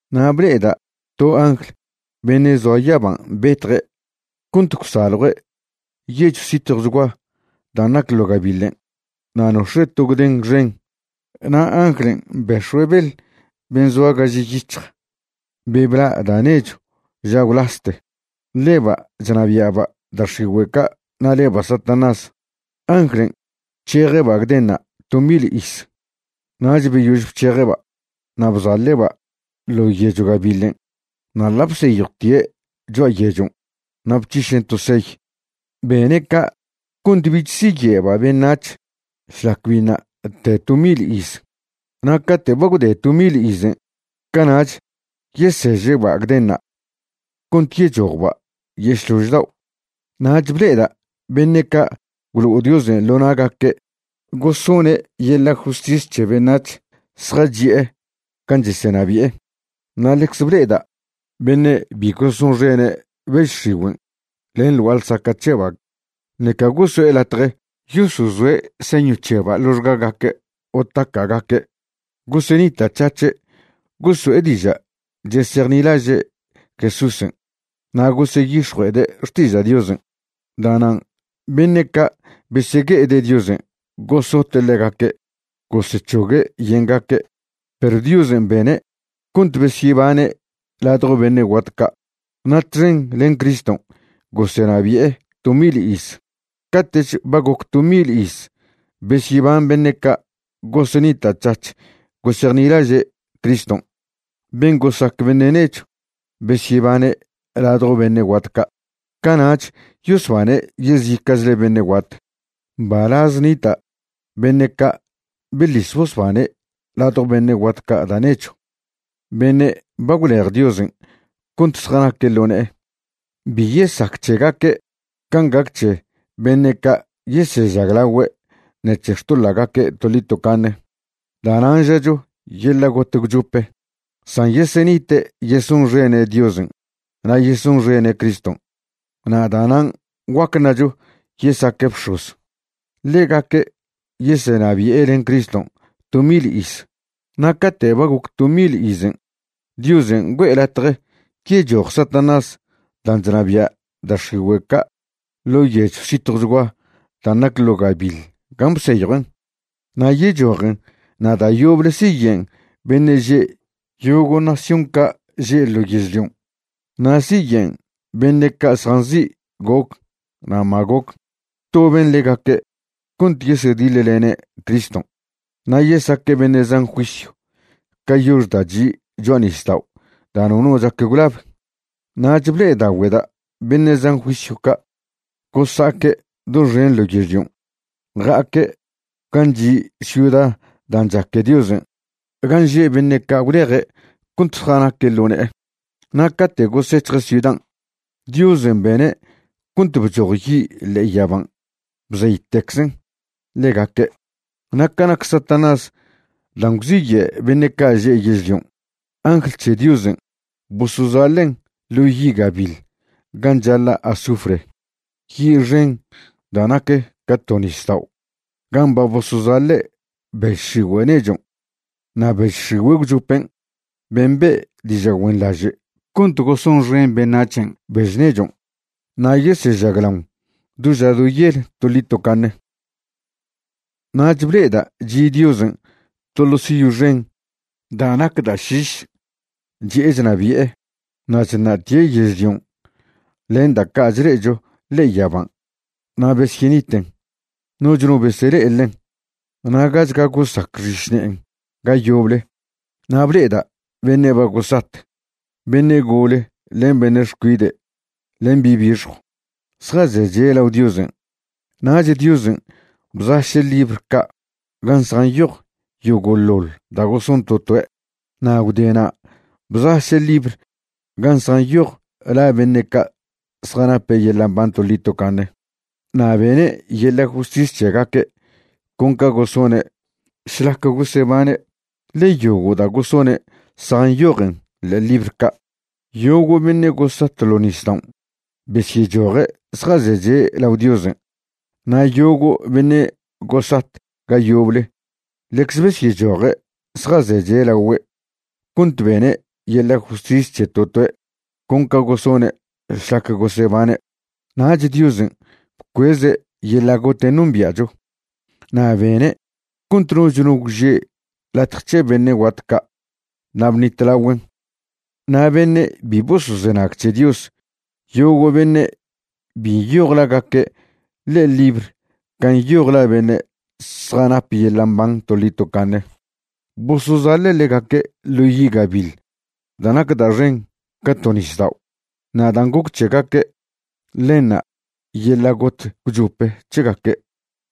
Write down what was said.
Na' ble'eda' to angl beṉe' zoa yaban' betje' cont gwsaljue' yechw zitjwchgua dan' nac ḻo gabiḻen', na' nox̱e' to gden xen. Na' anglen' bex̱oe' beḻ ben' zoa gaž yic̱hj, be bla' da' nechw ža gwlaste. Ḻeba' chnabia'ba' da' x̱igüe' ca' na' leba' Satanás. Anglen' bc̱heje'ba' gdenṉa' to mil iz. Nach beyož bc̱heje'ba', na' bzaḻe'ba' ḻo' yechw gabiḻen' na' ḻa' bseyjwtie' cho'a yechon' na' bc̱hišen' to seyw. Bene' ca' cont bich siye'ba' beṉac̱h šlac biṉa' te to mil iz. Na' cate' ba gwde to mil izen', cana'ch yeseže'ba' gdenṉa' cont yechojba' yešlož dao'. Nach ble'eda' beṉe' ca' gwlo'o Diosen' ḻo na'gaque' gosone' yeḻa' justis c̱he beṉac̱h zjachi'e gan' chesenabi'e. Na' ḻecze ble'eda' beṉe' bi gosonxene' bež x̱igüen' len ḻ gua'a ḻsaca' c̱heba' ṉeca goso'e latje yosozoe' señw c̱heba' ḻoxgagaque' o taca'gaque'. Gosenita'c̱hac̱he' goso'e diža' chesejnilaže' Jesúsen' na' goseyix̱jue'ede' xtiža' Diosen'. Da'nan' beṉe' ca' besegue'ede' Diosen' gosote' ḻegaque' gosec̱hogue' yengaque'. Perw Diosen' bene' cont besyebane' ladjo beṉe' guat ca', na' txen len Criston' gosenabi'e to mil iz. Cate'ch ba goc to mil iz besyeban beṉe' ca' gosenita'c̱hac̱h gosejnilaže' Criston', ben' gosac beṉe' nechw besyebane' ladjo beṉe' guat ca', cana'ch yosbane' yezica'chle beṉe' guat. Mbalaz nita' beṉe' ca' beḻis bosbane' ladjo beṉe' guat ca' da' nechw, beṉe' ba gwlej Diosen' cont zjanaque' ḻo ne'e. Bi yesac c̱hegaque' can' gac c̱he beṉe' ca' yesežaglagüe' ṉec̱he xtoḻa'gaque' toḻi tocaṉe, da'nan' žacho yeḻa' got gwchope. San yesenite' yesonxene' Diosen' na' yesonxene' Criston', na' da'nan' guac ṉacho yesaque' bx̱oz. Ḻegaque' yesenabi'e len Criston' to mil iz. Na' cate' ba goc to mil izen', Diosen' güe'e latje yechoj Satanás dan' chnabia' da' x̱igüe' ca' ḻo' yechw zitjwchgua dan' nac ḻo gabiḻ gan' bseyjuen'. Na' yechojen na' da' yoble siyen' beṉe' že' yogo' nación ca' že' ḻo yežlion'. Na' siyen' beṉe' ca' zjanzi' Gog na' Magog, gwtoben ḻegaque' cont yesediḻlene' Criston', na' yesaque' beṉe' zan juisyw ca yox da' chi' cho'a nisdao' da' nono chac gwlab. Nach ble'edagüe'da' beṉe' zan juisyw ca', gosa'aque' doxen ḻo yežlion', ja'aque' gan' chi' ciuda dan' chaque Diosen' gan' že' beṉe' ca' gwleje' cont zjanaque' ḻo ne'e. Na' cate' gosec̱hje' ciudan', Diosen' bene' cont bchoj yi' ḻe'e yaban' bzeytecczen ḻegaque'. Na' ca nac Satanás dan' gwziye' beṉe' ca' že' yežlion', angl c̱he Diosen' bosozaḻen' ḻo yi' gabiḻ gan' chaḻa' azufre, yi' xen da' nac ca to nisdao' gan' ba bosozaḻe' bež x̱igüe' nechon' na' bež x̱igüe' gwchopen' ben' be' diža' güenḻaže' cont gosonxen beṉac̱hen' bež nechon'. Na' yesežaglaon do ža do yel toḻi tocaṉe. Nach ble'eda' chi' Diosen' to ḻo siy xen da' nac da' šiš, chi'e chnabi'e. Na' chṉa'tie' yežlion' len da' ca' chle'echo ḻe'e yaban' na' besyeniten, noch no besele'e ḻen, na' gach ga gosac xišne'en ga yoble. Na' ble'eda' beṉe' ba gosat, beṉe' gole len beṉe' xcuide' len bi' bixjw, zjazeche' lao Diosen'. Nach Diosen' bzaše' libr ca' gan' zjanyoj yogo'ḻoḻ da' goson to toe'. Na' gwdena' bzaše' libr gan' zjanyoj la beṉe' ca' zjanape' yeḻa' mban toḻi tocaṉe. Na' bene' yeḻa' justis c̱hegaque' con ca gosone' šlac gosebane', ḻe yogo' da' gosone' zjanyojen ḻe'e libr ca'. Yogo' beṉe' gosat ḻo' nisdaon' besyechoje' zjazeche' lao Diosen', na' yogo' beṉe' gosat ga yoble ḻecze besyechoje' zjazeche' lagüe' cont bene' yeḻa' justis c̱he to toe' con ca gosone' šlac gosebane'. Nach Diosen' bcueze' yeḻa' goten' nombia'cho, na' bene' cont noch no gwže' latje c̱he beṉe' guat ca' na' bṉitlagüen'. Na' beṉe' bi bosozenag c̱he Dios, yogo' beṉe' bi nyoj lagaque' ḻe'e libr gan' nyoj la beṉe' zjanap yeḻa' mban toḻi tocaṉe, bosozaḻe' ḻegaque' ḻo yi' gabiḻ da' nac da' xen ca to nisdao'. Na' dan' goc c̱hegaque', ḻenṉa' yeḻa' got gwchope c̱hegaque'.